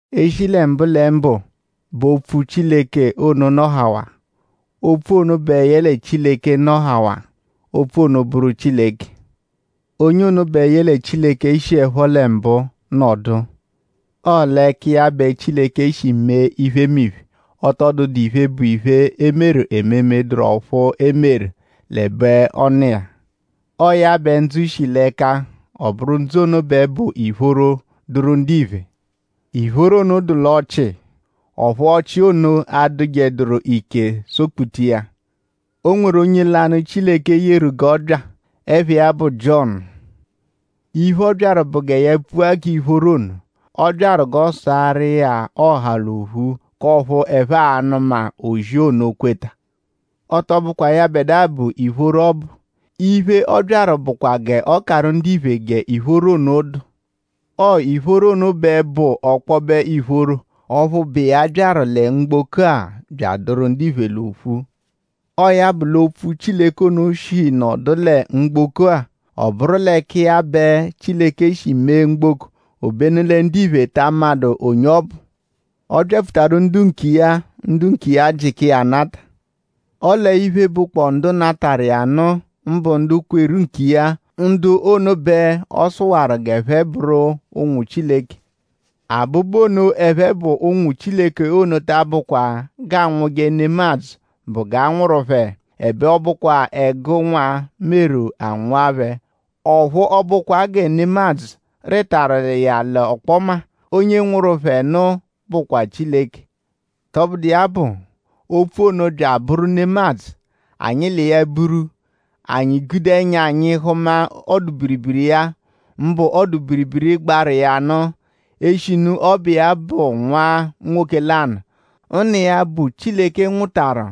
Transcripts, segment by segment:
E -shi lẹ mbụlembu bẹ Opfu Chileke ono nọhawaa. Opfu ono bẹ yẹle Chileke nọhawaa. Opfu ono bụru Chileke. Onye ono bẹ yẹle Chileke shiẹpho lẹ mbụ nọdu. Ọo l'ẹka iya bẹ Chileke shi mee iphemiphe. Ọ tọ dụdu iphe, bụ iphe, e meru ememe, dụru ọphu e meru l'ẹbe ọ nọ iya. Ọo ya bẹ ndzụ shi l'ẹka; ọ bụru ndzụ ono bẹ bụ ìphóró, dụru ndiphe. Ìphóró ono dụ l'ọchii; ọphu ọchii ono adụjeduru ike sọ-kputa iya. O nweru onye lanụ, Chileke yeru g'ọ bya. Ẹpha iya bụ Jiọnu. Iphe, ọ byaru bụ gẹ ya pfua k'iphoro ono. Ọ byaru g'ọ saarụ iya ọha l'ophu; k'ọphu ẹphe a-nụma ozi ono kweta. Ọ tọ bụkwa yẹbedua bụ ìphóró ọbu. Iphe, ọ byaru bụkwa g'ọ karụ ndiphe g'ìphóró ono dụ. Ọo ìphóró ono bẹ bụ ọkpobe ìphóró; ọphu bụ iya byaru lẹ mgboko-a bya adụru ndiphe l'ophu. Ọo ya bụ lẹ Opfu Chileke ono shi nọdu lẹ mgboko-a. Ọ bụru l'ẹka iya bẹ Chileke shi mee mgboko; obenu lẹ ndiphe ta amadụ onye ọ bụ. Ọ byapfutaru ndu nkiya; ndu nkiya jịka iya anata. Ọle iphe, bụkpoo ndu natarụ iya nụ; mbụ ndu kweru nkiya; ndu ono bẹ ọ sụwaru g'ẹphe bụru ụnwu Chileke. Abụbu ono, ẹphe bụ ụnwu Chileke ono ta abụkwa g'aanwụje nemadzụ bụ g'a nwụru phẹ; ẹbe ọ bụkwa ẹgu nwa meru a nwụa phẹ; ọphu ọ bụkwa gẹ nemadzụ rịtaru iya l'ọkpoma; onye nwụru phẹ nụ bụakwaa Chileke. Tọbudu iya bụ; Opfu ono bya abụru nemadzụ; anyi l'iya buru. Anyi gude ẹnya anyi hụma ọdu-biribiri iya; mbụ ọdu-biribiri, gbaru iya nụ; eshinu ọ bụ iya bụ Nwa nwoke lanụ, Nna iya, bụ Chileke nwụtaru.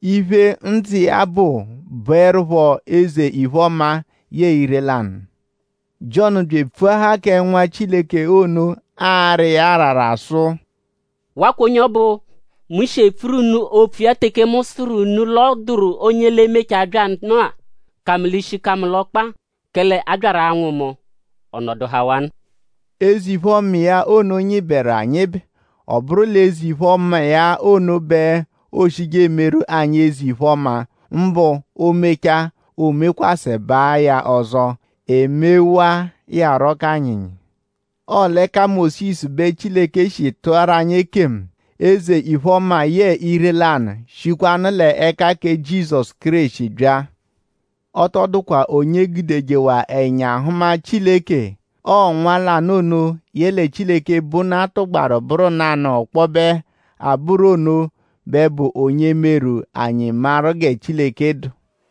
Iphe, ndzụ iya bụ bụerupho eze-iphe-ọma yẹe ire-lanụ. Jiọnu bya epfuahaa kẹ Nwa Chileke ono; ara iya arara sụ: “Wakwa onye ọbu, mu shi epfuru unu opfu iya teke mu sụru unu l'ọ dụru onye l'e-mechaa bya nụ-a, ka mu l'ishi ka mu l'ọkpa; kẹle a byaru anwụ mu ọ nọduhawanu.” Eze-iphe-ọma iya ono nyịberu anyịbe. Ọ bụru l'eze-iphe-ọma iya ono b'ooshije emeru anyi eze-iphe-ọma; mbụ o -mechaa; oomekwasẹbaa ya ọzo; emewaa iya rọ k'anyịnyi. Ọo l'ẹka Mósisu bẹ Chileke shi tụaru anyi ekemu. Eze-iphe-ọma yẹe ire-lanụ shikwanụ l'ẹka kẹ Jizọsu Kéreshi bya. Ọ tọ dụkwa onye gudejewaa ẹnya hụma Chileke. Ọo Nwa lanụ ono, yẹle Chileke, bụ Nna tụgbaru bụru nanụ ọkpobe abụru ono bẹ bụ onye meru; anyi maru gẹ Chileke dụ.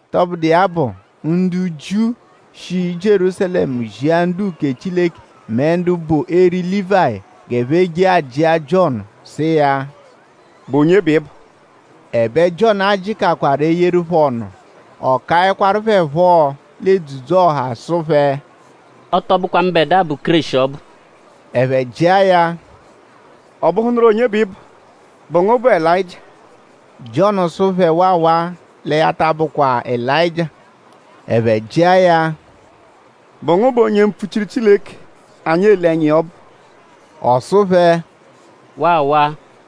Tọbudu iya bụ; ndu Jiu shi Jierúsalẹmu zia ndu-uke Chileke mẹ ndu bụ eri Lívayi g'ẹphe je ajịa Jiọnu sụ iya: “?Bụ onye bẹ ị bụ?” Ẹbe Jiọnu ajịkakwaru eyeru phẹ ọnu. Ọ kaẹkwaru phẹ phọ l'edzudzu-ọha sụ phẹ: “Ọ tọ bụkwa mbẹdua bụ Kéreshi ọbu.” Ẹphe jịa ya; “?Ọ bụhunuru onye bẹ ị bụ??Bụ ngu bụ Elayịjia?” Jiọnu sụ phẹ waawaa; lẹ ya ta abụkwa Elayịjia. Ẹphe jịa ya: “?Bụ ngu bụ onye mpfuchiru Chileke, anyi ele ẹnya iya ọbu?” Ọ sụ phẹ: “Waawaa.”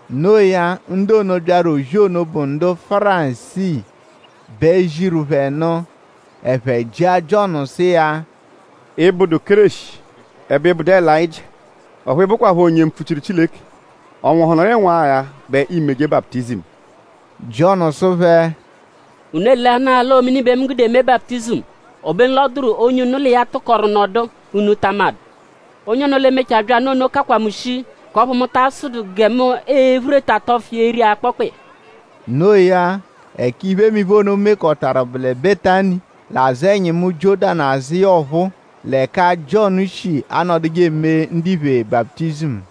No iya; ndu ono, byaru ozi ono bụ ndu Fárisii bẹ ziru phẹ nụ. Ẹphe jịa Jiọnu sụ iya: “Ị -bụdu Kéreshi; ẹbe ị bụdu Elayịjia; ọphu ị bụkwapho onye mpfuchiru Chileke;?ọ nwụhunuru ịnwu-agha bẹ iimeje baputizimu?” Jiọnu sụ phẹ: “Unu eleanaa l'ọo mini bẹ mu gude eme baputizimu. Obenu l'ọ dụru onye unu l'iya tụkoru nọdu, unu ta amadụ. Onye ono, l'e-mechaa bya nụ ono kakwa mu shii; k'ọphu mu ta asụdu gẹ mu e-phureta tọfu iya eri akpọkpa iya.” No iya; ẹka iphemiphe ono mekọtaru bụ lẹ Betani; l'azụ ẹnyimu Jiọ́danu azụ iya ọphuu; l'ẹka Jiọnu shi anọduje eme ndiphe baputizimu.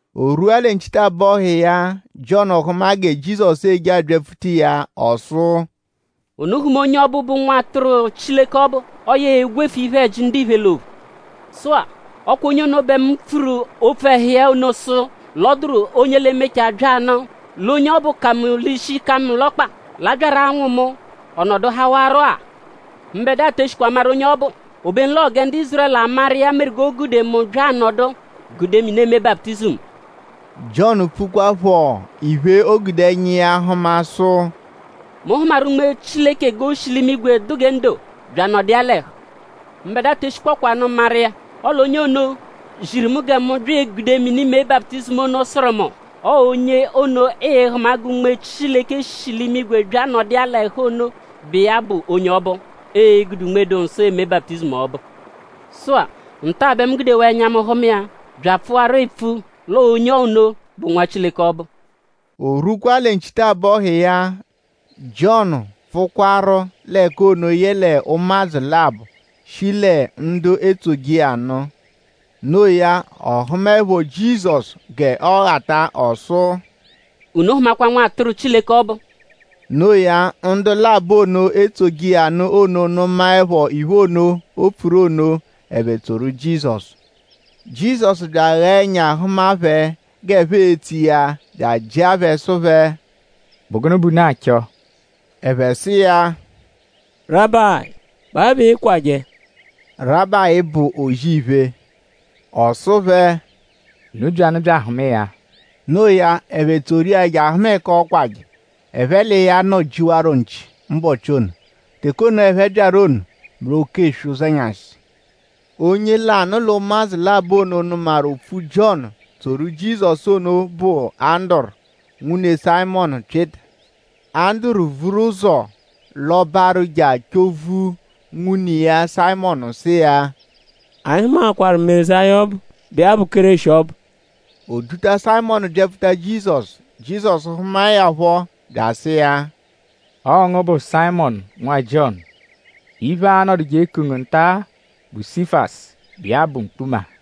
O rwua lẹ nchitabọhu iya; Jiọnu hụma gẹ Jizọsu eje abyapfuta iya. Ọ sụ: “Unu hụma onye ọbu, bụ Nwatụru Chileke ọbu. Ọo ya e-gwefu iphe-ẹji ndiphe l'ophu! Sụ-a; ọ kwa onye ono bẹ mu pfuru opfu ẹhu iya ono sụ l'ọ dụru onye l'e-mechaa bya nụ. L'onye ọbu ka mu l'ishi ka mu l'ọkpa. L'a byaru anwụ mu; ọ nọduhawaro-a. Mbẹdua te eshikwa maru onye ọ bụ; obenu l'ọo gẹ ndu Ízurẹlu amaru iya meru g'o gude mu bya anọdu; gude mini eme baputizimu.” Jiọnu pfukwaaphọ iphe, o gude ẹnya iya hụma sụ: “Mu hụmaru Unme Chileke g'o shi l'imigwe dụ gẹ ndo bya anọdu iya l'ẹhu. Mbẹdua te eshikpọkwanu maru iya; ọle onye ono, ziru mu gẹ mu bya egude mini mee baputizimu ono sụru mu: ‘Ọo onye ono, ịi-hụma gẹ Unme Chileke shi l'imigwe bya nọdu iya l'ẹhu ono bụ iya bụ onye ọbu, e-gude Unme-dụ-Nsọ eme baputizimu ọbu.’ Sụ-a; nta-a bẹ mu gudewaa ẹnya mu hụma iya bya apfụwaru epfu l'ọo onye ono bụ Nwa Chileke ọbu.” O rwukwaa lẹ nchitabọhu iya; Jiọnu pfụkwaru l'ẹka ono yẹle ụmadzu labọ, shi lẹ ndu etsoje iya nụ. No iya; ọ hụmaepho Jizọsu g'ọoghata ọ sụ: “Unu hụmakwa Nwatụru Chileke ọbu.” No iya; ndu labọ ono, etsoje iya nụ ono nụmaepho iphe ono, o pfuru ono; ẹphe tsoru Jizọsu. Jizọsu bya aghaa ẹnya hụma phẹ g'ẹphe etso iya bya ajịa phẹ sụ phẹ: “?Bụ gụnu bẹ unu achọ?” Ẹphe sụ iya: “Rabayi!?Bụ awe bẹ ịikwaje?” Rabayi bụ O-zì-iphe. Ọ sụ phẹ: “Unu byanụ bya ahụma iya.” Noo ya; ẹphe tsoru iya je ahụma ẹka ọokwaje. Ẹphe l'iya nọ-jiwarọ nchi mbọchi ono. Teke ono, ẹphe byaru ono bụ l'oke eswe ụzenyashi. Onye lanụ l'ụmadzu labọ ono, nụmaru opfu Jiọnu; tsoru Jizọsu ono; bụ Anduru, nwune Sayịmonu Pyịta. Anduru vuru ụzo lọbaru je achọ-vu nwune iya Sayịmonu sụ iya: “Anyi hụmaakwaru Mezaya ọbu, bụ iya bụ Kéreshi ọbu.” O duta Sayịmonu byapfuta Jizọsu. Jizọsu hụmae ya phọ bya asụ iya: “Ọo ngu bụ Sayịmonu, bụ nwa Jiọnu. Iphe, aa-nọduje eku ngu nta-a bụ Sifasu, bụ iya bụ Mkpuma.”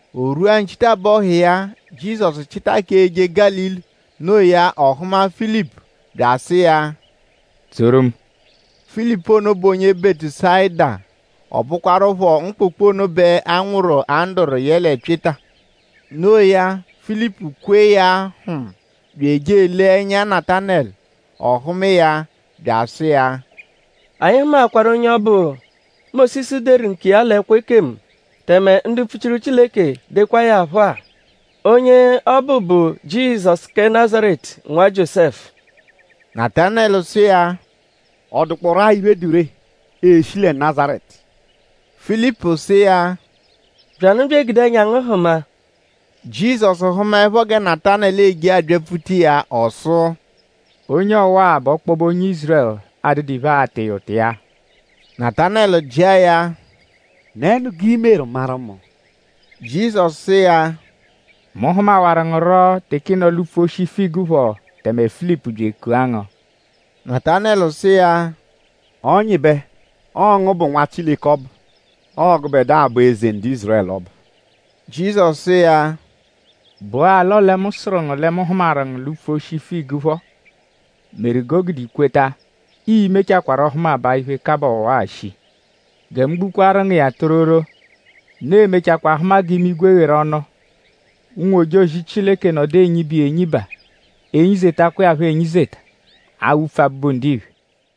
O rwua nchitabọhu iya; Jizọsu chịta k'eje Gálili. No iya; ọ hụma Filipu; bya asụ iya “Tsoru mu.” Filipu ono bụ onye Bẹtusayida. Ọ bụkwarupho mkpụkpu ono bẹ a nwụru Anduru yẹle Pyịta. No iya; Filipu kwe iya hm; bya eje elee ẹnya Natanẹlu. Ọ hụma iya bya asụ iya: “Anyi hụmaakwaru onye ọbu, Mósisu deru nkiya l'ẹkwo ekemu; tẹme ndu mpfuchiru Chileke dekwaa ya phọ-a. Onye ọ bụ bụ Jizọsu kẹ Nazaretu, nwa Jiósẹfu.” Natanẹlu sụ iya: “?Ọ dụkporu-a iphe, dụ ree, e-shi lẹ Nazaretu?” Filipu sụ iya: “Byanụ bya egude ẹnya ngu hụma.” Jizọsu hụmaepho gẹ Natanẹlu eje abyapfuta iya; ọ sụ: “Onye ọwa-a bụ ọkpobe onye Ízurẹlu, adụdu iphe, aata iya ụta iya.” Natanẹlu jịa ya: “?Nẹnu g'i meru maru mu?” Jizọsu sụ iya: “Mu hụmahawaru ngu rọ teke ị nọ l'upfu oshi figu phọ tẹme Filipu bya ekua ngu.” Natanẹlu sụ iya: “Ọnyibe! Ọo ngu bụ Nwa Chileke ọbu. Ọo gụbedua bụ Eze ndu Ízurẹlu ọbu.” Jizọsu sụ iya: “?Bụ-a l'ọle mu sụru ngu lẹ mu hụmaru ngu l'upfu oshi figu phọ meru g'o gude i kweta? Ii-mechakwarọ hụmabaa iphe, kabaa ọwa-a shii! Gẹ mu gbukwaru ngu iya tororo; unu e-mechakwaa hụma g'imigwe gheru ọnu; ụnwu-ojozi Chileke nọdu enyiba iya enyiba; enyizetakwa iya phọ enyizeta awupfu Abụbu-Ndiphe.”